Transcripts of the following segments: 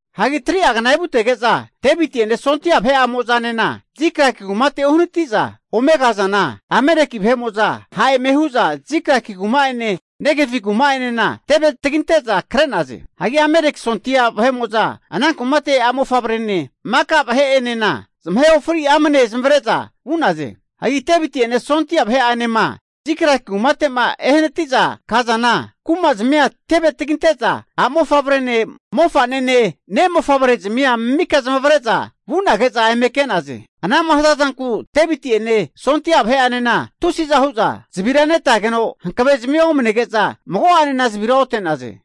Hagi 3'a zage kna evutege'za Deviti'ene sondia vahe'amo'zanena Ziklag kumate uhanati'za ome kazana, Ameleki vahe'mo'za ha' eme hu'za, Ziklagi kuma'ene Negevi kuma'enana teve taginte'za kre'naze. Hagi Ameleki sondia vahe'mo'za ana kumate a'mofavrene maka vahe'enena zamahe ofri amne zamavare'za vu'naze. Hagi Deviti'ene sondia vahe'anema Ziklagi kumate'ma ehanati'za kazana, kumazmia teve taginente'za a'mofavrene mofa'nene ne' mofavrezamia mika zamavare'za vu'nage'za eme ke'naze. Ana'ma hazazanku Deviti'ene sondia vahe'anena tusiza hu'za zavira netageno hankave'zimia omanege'za mago'anena zavira ote'naze.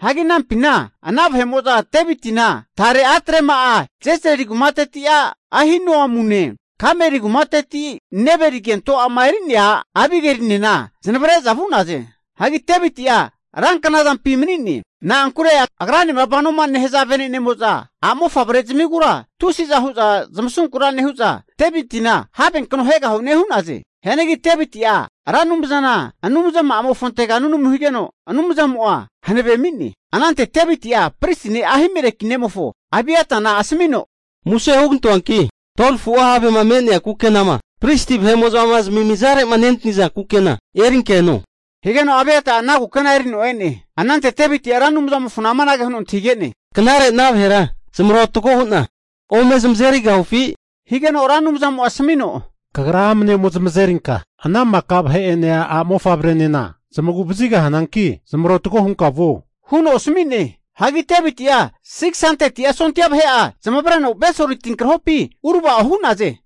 Hagi anampina ana vahe'mo'za Devitina tare a'trema'a, Jezrili kumateti a' Ahinoamune, Kameli kumateti Nebali kento a'ma eri'nea a' Abigelinena zanavre'za vu'naze. Hagi Deviti'a ranknazampi mani'ne. Na'ankure agranema vanoma nehaza vene'nemo'za a'mofavre zamigura tusiza hu'za zamasunkura nehu'za Devitina havenkno ahegahune hu'naze. Hianagi Deviti'a Ra Anumzana Anumzama'amofontega nunamu higeno, Anumzamo'a hanave ami'ne. Anante Deviti'a pristi ne' Ahimeleki nemofo Abiata asamino, muse hugantoanki 12fua havema me'nea kukenama pristi vahe'mo'za zamimizare'ma nentaza kukena erinka eno, higeno Abiata'a ana kukena erino e'ne. Anante Deviti'a Ra Anumzamofona amanage huno antahige'ne, Knare ana vahera zamarotgo hu'na ome zamazerigahufi? Higeno Ra Anumzamo'a asamino, Kagra amane ome zamazerinka ana maka vahe'ene a'mofavrenena zamagu vazigahananki zamarotgo hunka vuo huno asami'ne. Hagi Deviti'a 600'a sondia vahe'a zamavareno Besori tinkrahopi uravao hu'naze.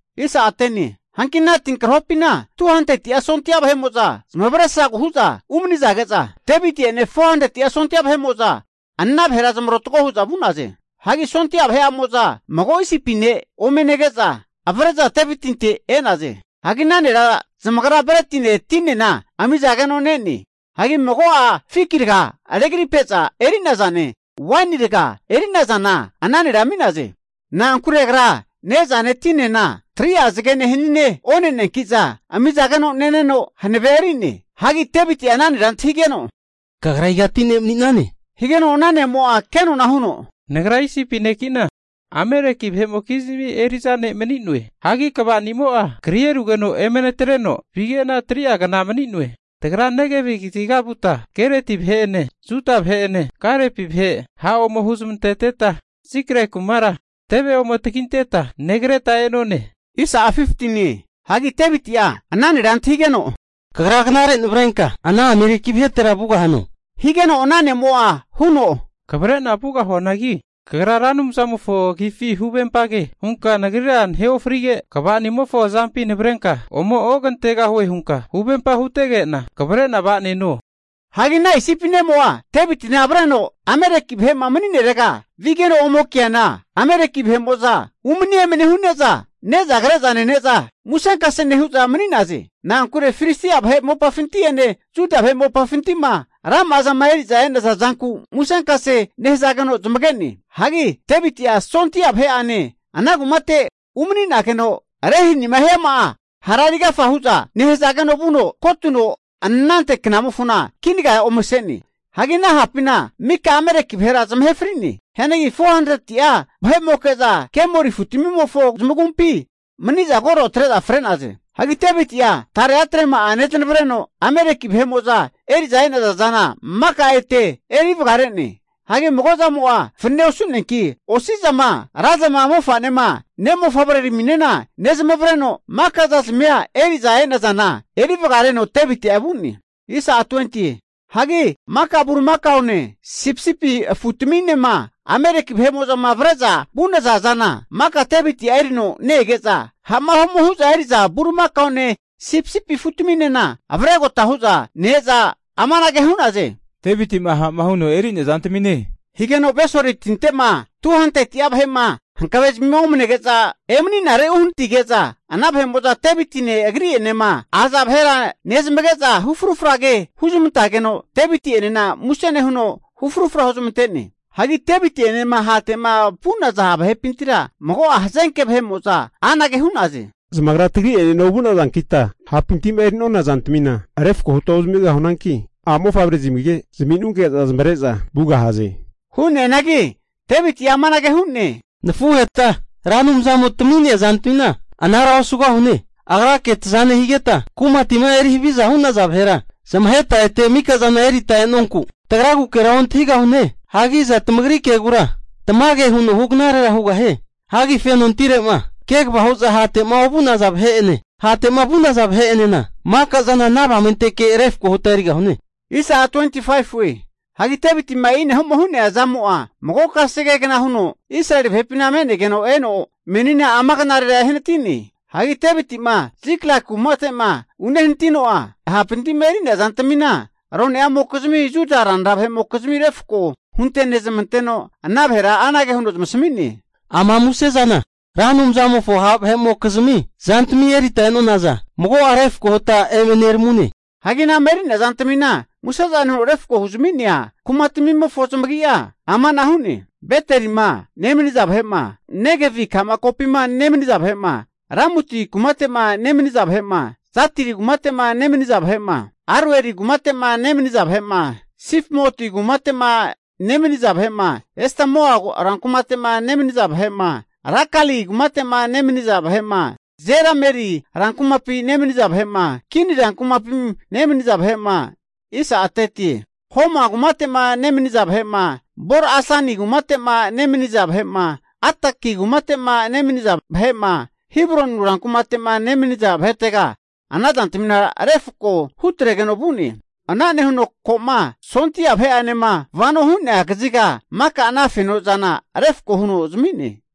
Hanki ana tinkrahopina 200'a sondia vahe'mo'za zamavaresragu hu'za umanizage'za, Deviti'enena 400'a sondia vahe'mo'zaana vahera zamarotago hu'za vu'naze. Hagi sondia vahe'amo'za, mago Isipi ne' ome nege'za, avre'za Devitinte e'naze. Hagi ana nera zamagra bretine tinena amizageno ne'ne. Hagi mago'a fiki raga'a regripe'za eri'nazane, waini raga eri'nazana ana nera ami'naze. Na'ankure agra ne'zane tinena 3'a zagene hanine oneneanki'za ami'zageno neno hanavea eri'ne. Hagi Deviti'a ana nera antahigeno, Kagra igati ne' mani'nane? Higeno ana ne'mo'a kenona huno, nagra Isipi neki'na, Ameleki vahe'mokizmi eri'za ne' mani'noe. Hagi kvanimo'a kri erugeno eme natreno vige'na 3'a kna mani'noe. Tagra Negevi kaziga vuta Kereti vahe'ene Juda vahe'ene Kalepi vahe ha' ome huzamanteteta, Ziklag kumara teve ome taginteta negreta e'none. Hagi Deviti'a ana nera antahigeno, Kagra knare navrenka ana Ameleki vahetera vugahano? Higeno ana ne'mo'a huno, Kavre'na vugahuanagi, kagra Ra Anumzamofo agifi huvempage hunka nagrira nahe ofrige, kvani'amofo azampi navrenka ome ogantegahue hunka huvempage hutege'na, kavre'na va'neno. Hagi ana Isipi ne'mo'a, Devitina avreno Ameleki vahe'ma mani'narega vigeno ome keana, Ameleki vahe'mo'za umani emani hu'neza ne'za kre'za nene'za musenkase nehu'za mani'naze. Na'ankure Filistia vahe mopafinti'ene Juda vahe mopafinti'ma rama'a zama eri'za e'naza zanku musenkase nehazageno zamage'ne. Hagi Deviti'a sondia vahe'ane ana kumate umani'nageno rehanima hiama'a hara erigafa hu'za nehzageno, vuno kotuno anante knamofona kinaga omese'ne. Hagi ana ha'pina maka Ameleki vahera zamahe fri'ne. Hianagi 400'a vahe'moke'za kemori afutamimofo zamagumpi mani'za koro atre'za fre'naze. Hagi Deviti'a tare atrema'a neznavreno Ameleki vahe'mo'za eri'za e'naza zana maka ete eri vagare'ne. Hagi mago zamo'a fanane osu'neanki, osi'zama razama mofa'nema nemofavreramina nezamavareno, maka zazmima eri'za e'nazana eri vagareno Deviti'a vu'ne. Hagi maka bulimakaone, sipisipi afutaminema Ameleki vahe'mo'zama avre'za vu'naza zana maka Devitia erino ne-ege'za ha'ma ome hu'za eri'za bulimakaone sipisipi afutaminena avregota hu'za ne-eza amanage hu'naze, Deviti'ma ha'ma huno eri'nea zantamine. Higeno Besori tinte'ma 200'a vahe'ma hankavezimi omanege'za emeni'nare uhanatige'za, ana vahe'mo'za Devitine agri'enema aza vahera nezamage'za hu frufra ke huzamantageno, Deviti'enena muse nehuno hu frufra huzmante'ne. Hagi Deviti'enema hate'ma vu'naza vahepintira mago'a hazenke vahe'mo'za, anage hu'naze, Zamagra tagri'enena ovu'nazankita ha'pinti'ma eri'nona zantamina refko huta ozamigahunanki, a'mofavre'zimige zaminunke'za zamavare'za vugahaze. Hu'neanagi Deviti'a amanage hu'ne, Nafuheta Ra Anumzamo tami'nea zantamina anara osugahune. Agrake taza nehigeta kumatima eri haviza hu'naza vahera zamaheta ete mikazana erita e'nonku, tagragukera ontahigahune. Hagi iza tamagri kegura tamage huno hugnarera hugahie? Hagi fenotire'ma kegava hu'za hate'ma ovu'naza vahe'ene hate'ma vu'naza vahe'enena, maka zana ana avamenteke refko huta erigahune. Hagi Devitima e'ina'ma hu'nea zamo'a mago kasegegna huno Israeli vahepina me'negeno eno, meni ama knarera ehanati'ne. Hagi Deviti'ma Ziklag kumate'ma unehanatino'a hapinti'ma eri'nea zantamina rone'amokizmi Juda ranra vahe'mokizmi refko huntenezmanteno, ana vahera anage huno zamasami'ne, Ama muse zana Ra Anumzamofo ha' vahe'mokizmi zantami erita e'nonaza, mago'a refko huta eme neramune. Hagi ana'ma eri'nea zantamima musezane huno refko'ma huzami'nea kumatamimofo zamagi'a amana hu'ne, Betelima nemaniza vahe'ma, Negevi ka'ma kokampi nemaniza vahe'ma Ramuti kumate'ma nemaniza vahe'ma, Jatiri kumate'ma nemaniza vahe'ma, Aroeri kumate'ma nemaniza vahe'ma, Sifmoti kumate'ma nemaniza vahe'ma Estemoa rankumate'ma nemaniza vahe'ma, Rakali kumate'ma nemaniza vahe'ma Jerameri rankumapi nemaniza vahe'ma, Kin rankumapi nemaniza vahe'ma, Homa kumate'ma nemaniza vahe'ma, Bor-asani kumate'ma nemaniza vahe'ma, Ataki kumate'ma nemaniza vahe'ma, Hebroni rankumate'ma nemaniza vahetega ana zantamina refako hutregeno vu'ne. Ana nehuno koma sondia vahe'anema vano hu'nea kaziga maka ana fenozana refko huno zami'ne.